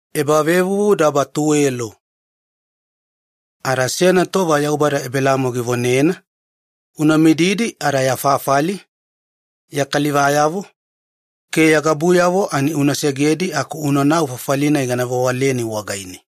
Ebelamo anavedo. E ada seyana tova Yaubada Ebelamo givonena, “Unamididi ada ya fafali, ya kalivayavo ke ya gabuyavo una segedi aku unanau fafali-nai gana vewaleni wagaine.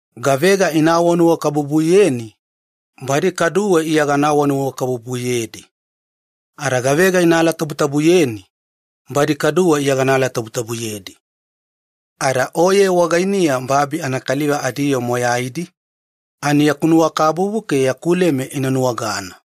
Gavega ina vonanuwakabubuyeni, kaduwe gana vonanuwakabubuyedi. Ada gavega ina alatabutabuyeni, kaduwe gana alatabutabuyedi. Ada oye wagainiya kaliva matatabuna babi wagaine vona nuwakabubu analeme ina nuwagana.”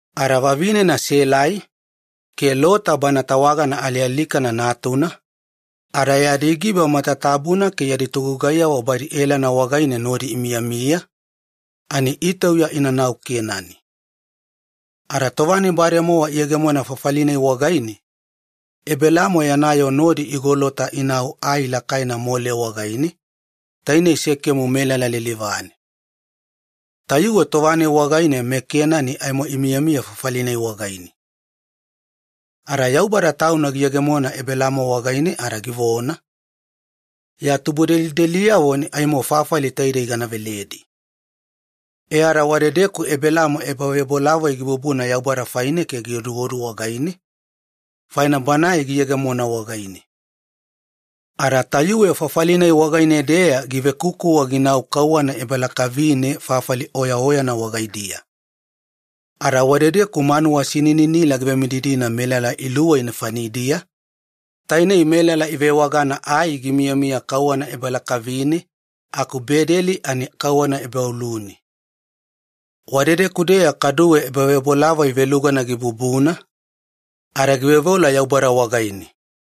Ada vavinena Selai ke Lota, tawagana alialikana natuna, ada yadi giba matatabuna ke yadi togugaiyavo badi Elana wagaine nodi imiyamiya ani itauya inanau Kenani. Ada tova-nai bademowa iyegemona fafali-nai wagaine, Ebelamo yana yoo nodi igolota inau ai lakaina Mole wagaine, tainei Sekemu melala lilivane. Tayuwe tova-nai wagaine meKenani aimo imiyamiya fafali-nai wagaine. Ada Yaubada Tauna giyegemona Ebelamo wagaine ada givona, “Ya tubudelideliyavo wagaidiya aimo fafali taidei gana veledi.” E ada wadedeku Ebelamo ebavebolavoi gibubuna Yaubada faine ke gioduodu wagaine, faina Banae giyegemona wagaine. Ada tayuwe fafali-nai wagaine-deya givekukuwa ginau kauwana ebalakavina fafali oyaoyana wagaidiya wadedeku manuwa sininila givemididina melala luwei nefanidiya, tainei Ai gimiyamiya kauwana ebalakavine aku Bedeli ani kauwana ebaolune. Wadedeku-deya kaduwe ebavebolavoi velugana gibubuna, ada gioduodu ke gitagivedadaga Yaubada wagaine.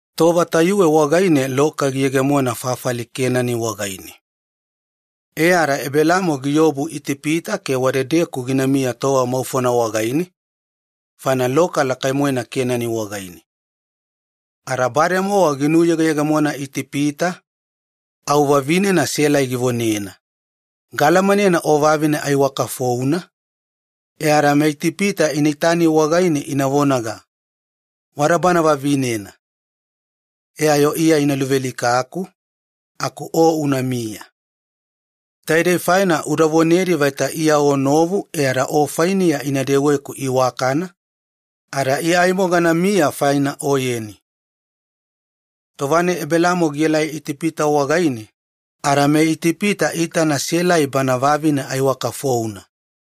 Tova tayuwe wagaine loka giyegemona fafali Kenani wagaine, ada Ebelamo giobu Itipita ke wadedeku ginamiya tova maufona wagaine faina loka lakai-moena Kenani wagaine. Ada bademowa ginuyegeyegemona Itipita, au vavinena Selai givonena, “Unaitana, gaalamanena o vavine aiwakafouna. Ada tova-nai meItipita ina itani e ada ina vonaga, 'Wada bana vavinena', aga aimo ina luvealikaku aku o unamiya. E ada keke una vonedi vaita iya mogane, aku una vonedi vaita iya o novu, ada ina gugai iwakana wagaikuya ada iya aimo ganamiya faina oyeni.” Tova-nai Ebelamo gielai Itipita wagaine, ada meItipita iitana Selai bana vavine aiwakafouna.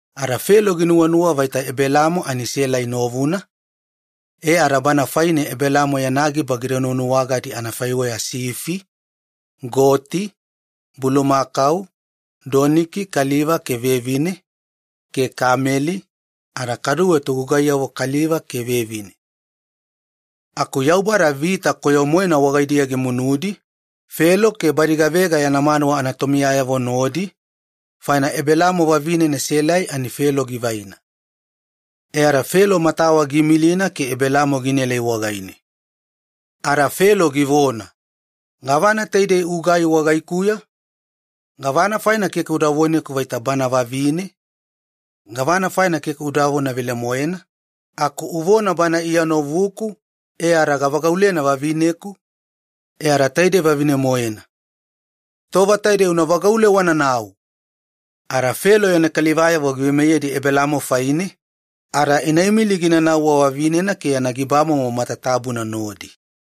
Ada Felo ginuwanuwa vaita Ebelamo ani Selai novuna ke bana faine Ebelamo yana giba ginuwanuwagadi anafaiweya sifi, goti, bulumakau, doniki kaliva ke vevine, ke kameli, ada kaduwe togugaiyavo kaliva ke vevine. Aku Yaubada veoga vita-moena wagaidiya gimunudi, Felo ke badi gavega yana manuwa anatomiyayavo nodi, faina Ebelamo vavinena Selai, ani Felo givaina. Ada tova-nai Felo giveoga wagaine, matawa giimilina ke Ebelamo ginaelai wagaine. Ada Felo givona, “Gavana taidei ugai wagaikuya? Ada gavana faina keke uda voneku vaita bana vavine? Gavana faina keke udavona velemoena, aku uvona ‘Bana iya novuku’, e ada gavagaulena vavineku. E ada taidei vavine-moena. Tova taidei una vagaule wananau!” Ada Felo giveimeyedi yana kalivayavo Ebelamo faine, inaimili ginanau wavavinena ke yana gibamomo matatabuna nodi.